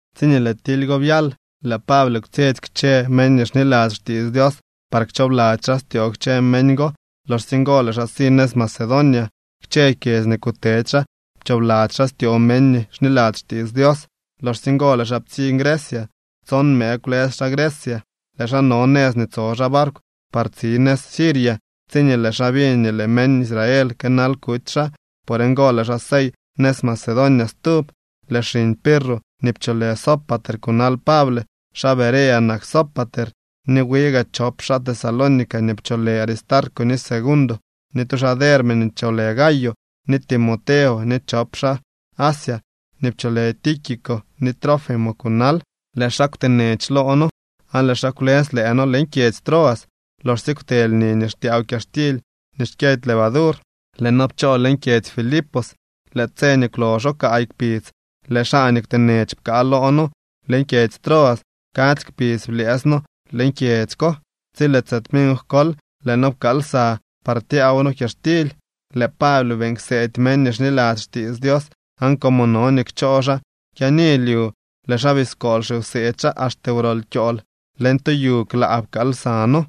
Tsiñee lëë tily go byal, lëë Pable kwtsyetsy kchë meñ nii xniladzy xtiits Dios par kchoobladzy xaa styoo kchë meñ go. Loxsye ngo lëë xaa si nëz Macedonia. Kchë kyedzy nii kutedy xaa pchoobladzy xaa styoo meñ nii xniladzy xtiits Dios. Loxsye ngo lëë xaa ptsiñ Grecia. Tson mëë kwlës xaa Grecia. Lëë xaa no nëz nii tso xaa barkw par tsi nëz Siria, tsiñee lëë xaa biñ nii lëë meñ Israel kënal kuty xaa. Por ngo lëë xaa sey nëz Macedonia stub. Lëë xiñ Pirro nii pcholë Sópater kunal Pable. Xaa Berea nak Sópater. Ni wi gaa chop xaa Tesalónica nii pcholë Aristarco ni Segundo, ni tu xaa Derbe nii pcholë Gayo, ni Timoteo, ni chop xaa Asia nii pcholë Tíquico ni Trófimo kunal. Lëë xaa kwtenech loo noo aan lëë xaa kwlës lëë noo leñ kyedzy Troas. Loxsye kwte lni nii xtyaaw kyaxtily nii xkyëdy levadur, lëë noo pchoo leñ kyedzy Filipos. Lëë tse nii kwloxo kaay kpidz lëë xaa nii kwtenech pkaa loo noo leñ kyedzy Troas. Kadzy kpidz blyëës noo leñ kyedzy ko. Tsi lëë tse tminkw kol lëë noo pkaal lsa par tyaaw noo kyaxtily. Lëë Pable beeñ kseedy meñ nii xniladzy xtiits Dios, aan como no nii kchoo xaa kyaani lyu, lëë xaa biskool xiwseedy xaa axte wrol kyool. Leñ tu yu klaa pkaal lsa noo.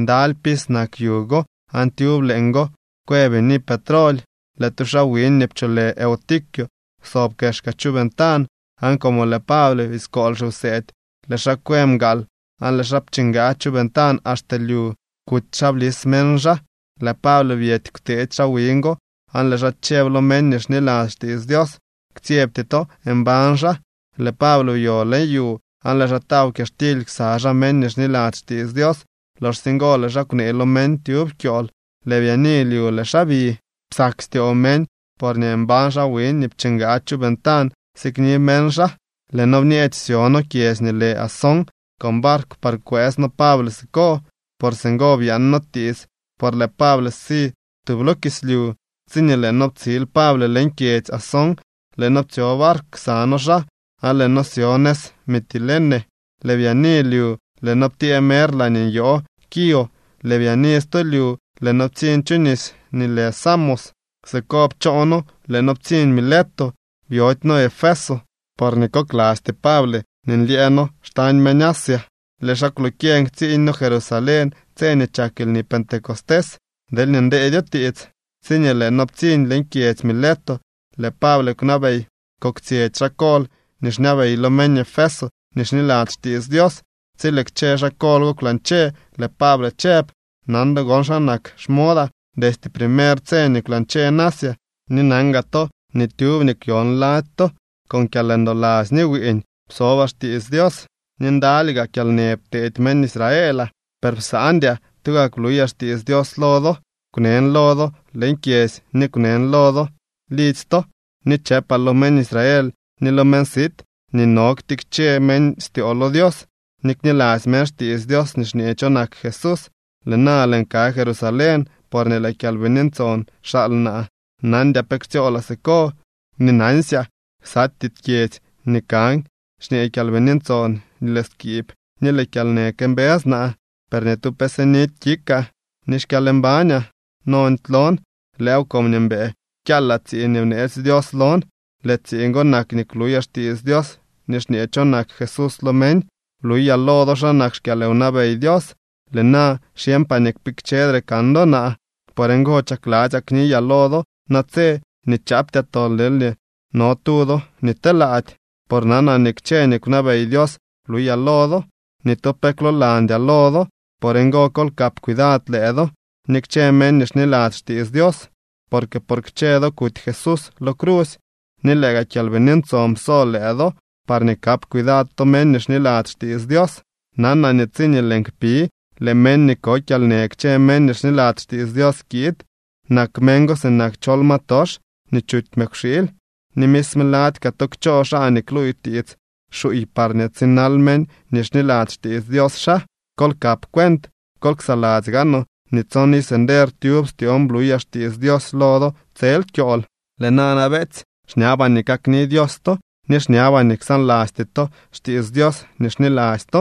Ndaly pis nak yu go. Aan tyub leeñgo kwë bini petroly. Lëë tu xaa wiñ nii pcholë Eutico kwsob kexka chu ventan. Aan como lëë Pable biskool xiwseedy, lëë xaa kwë mgaal aan lëë xaa pchingaa chu ventan axte lyu. Kuty xaa blis meñ xaa. Lëë Pable byety kwteetsy xaa wiñ go. Aan lëë xaa chëb lo meñ nii xniladzy xtiits Dios: —Ktsyebty to, mbañ xaa. Lëë Pable byo leñ yu aan lëë xaa taw kyaxtily ksa xaa meñ nii xniladzy xtiits Dios. Loxsye ngo lëë xaa kwnee lo meñ tyub kyool. Lëë byaani lyu lëë xaa bi. Psak styoo meñ porñee mbañ xaa wiñ nii pchingaa chu ventan sikni meñ xaa. Lëë noo bñeech syo noo kyedzy nii lë Asón con barkw par kwëës noo Pable siko, por singo byaan noo tiits por lëë Pable si tub lo kislyu. Tsiñee lëë noo ptsiil Pable leñ kyedzy Asón, lëë noo ptsyo barkw ksa noo xaa, aan lëë noo syo nëz Mitilene. Lëë byaani lyu lëë noo ptyee mer laañee nyoo Quío. Lëë byaani stu lyu lëë noo ptsiñ chu nis nii lë Samos. Siko pchoo noo lëë noo ptsiñ Mileto. Byody noo Efeso porñee koklasty Pable nii nlyëë noo xtañ meñ Asia. Lëë xaa kwlokyeñ ktsiiñ noo Jerusalén tse nii chak lni Pentecostés, deelñee ndeedyo tiits. Tsiñee lëë noo ptsiñ leñ kyedzy Mileto, lëë Pable kwnabey koktsyetsy xaa kol nii xñabey lo meñ Efeso nii xniladzy xtiits Dios. Tsi lëë kchë xaa kol go kwlañche, lëë Pable chëb: —Nan do gon xa nak xmodaa destye primer tse nii kwlañcheen Asia. Ni nan gaa to nii tyub nii kwyon lady to con kyalndoladzy ni wiiñ psobaa xtiits Dios, ni ndaly gaa kyalnë pteedy meñ Israelaa. Per psaandyaa tugak bluyaa xtiits Dios lo do. Kwnen lo do leñ kyedzy ni kwnen lo do lidzy to. Ni chëpaa lo meñ Israel ni lo meñ sit nii no nii ktikche meñ styoo lo Dios ni kniladzy meñ xtiits Dios nii xñee cho nak Jesús. Lëë na lëën ka Jerusalén, porñee lëë Kyalbini Ntson xaal naa. Nandyaa pe ktsyoolaa siko. Ni nansyaa ksatyee kyedzy nii kan xñee Kyalbini Ntson nii lëë skiib ni lëë kyalnë këmbës naa. Per ni tu pe sinidy kikaa, ni xkyalmbañaa nondy lon. Lëëw comñee mbëë kyaalaa tsiiñ nii bneetsy Dios lon. Lëë tsiiñ go nak nii kluyaa xtiits Dios nii xñee cho nak Jesús lo meñ. ’Bluyaa lo do xa nak xkyalwnabey Dios. Lëë na xyeñpaa nii kpikchedre kan do naa. Por ngo chakladzyaa kniyaa lo do natse nii chaaptyaa tol deelñee no tu do nii telaady. Por nanaa nii kchë nii kwnabey Dios bluyaa lo do. Ni tu pe kwloolandyaa lo do. Por ngo, kol kap cuidad lëë do ni kchë meñ nii xniladzy xtiits Dios. Porque por kchë do kuty Jesús lo crusy ni lëë gaa Kyalbini Ntson pso lëë do parñee kap cuidad to meñ nii xniladzy xtiits Dios. Nanaa nii tsiñee lëën kpi, lëë meñ nii ko kyalnë kchë meñ nii xniladzy xtiits Dios kiid. Nak meñ go sinak chol ma tox nii chuty mëkwxiily. Ni misme lady kaa to kchoo xaa nii kluuy tiits xuuy parñee tsinal meñ nii xniladzy xtiits Dios xaa. Kol kap cuent, kol ksaladzy gaanoo nii tson iz nder tyub styoon bluyaa xtiits Dios lo do tsel kyool. ’Lëë nana, beetsy, xñabaa nii kakni Dios to ni xñabaa nii ksaanlasty to xtiits Dios nii xniladzy to.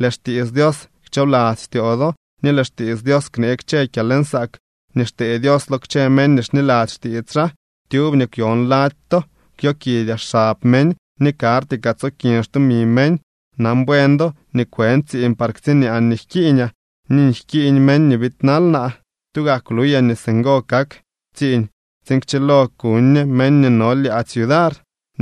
Lëë xtiits Dios kchoobladzy styoo do ni lëë xtiits Dios knee kchë kyalnsaak nii xtee Dios lo kchë meñ nii xniladzy xtiits xaa. Tyub nii kwyon lady to kwyokidyaa xab meñ ni karty kaa tsokin xtumi meñ. Nan buen do nii kwën tsiiñ par ktsiñaan nii jkiiñaa ni nii jkiiñ meñ nii biidnal naa. Tugak bluyaa nii singo kak tsiiñ tsiin kchilo kuñ ñe meñ nii no lyaadzy yudar,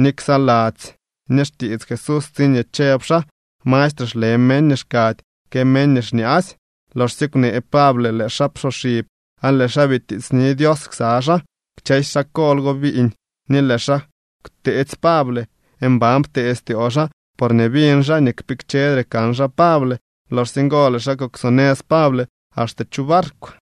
ni ksaladzy ñe xtiits Jesús tsiñee chëb xaa: “Mastre xle meñ nii xkady que meñ nii xñaasy.” Loxsye kwnee Pable lëë xaa psoxib aan lëë xaa bitiitsni Dios ksa xaa. Kchësy xaa kol go biiñ, ni lëë xaa kwteetsy Pable. Mban ptee styoo xaa porñee biñ xaa nii kpikchedre kan xaa Pable. Loxsye ngo lëë xaa kuksonëz Pable axte chu barkw.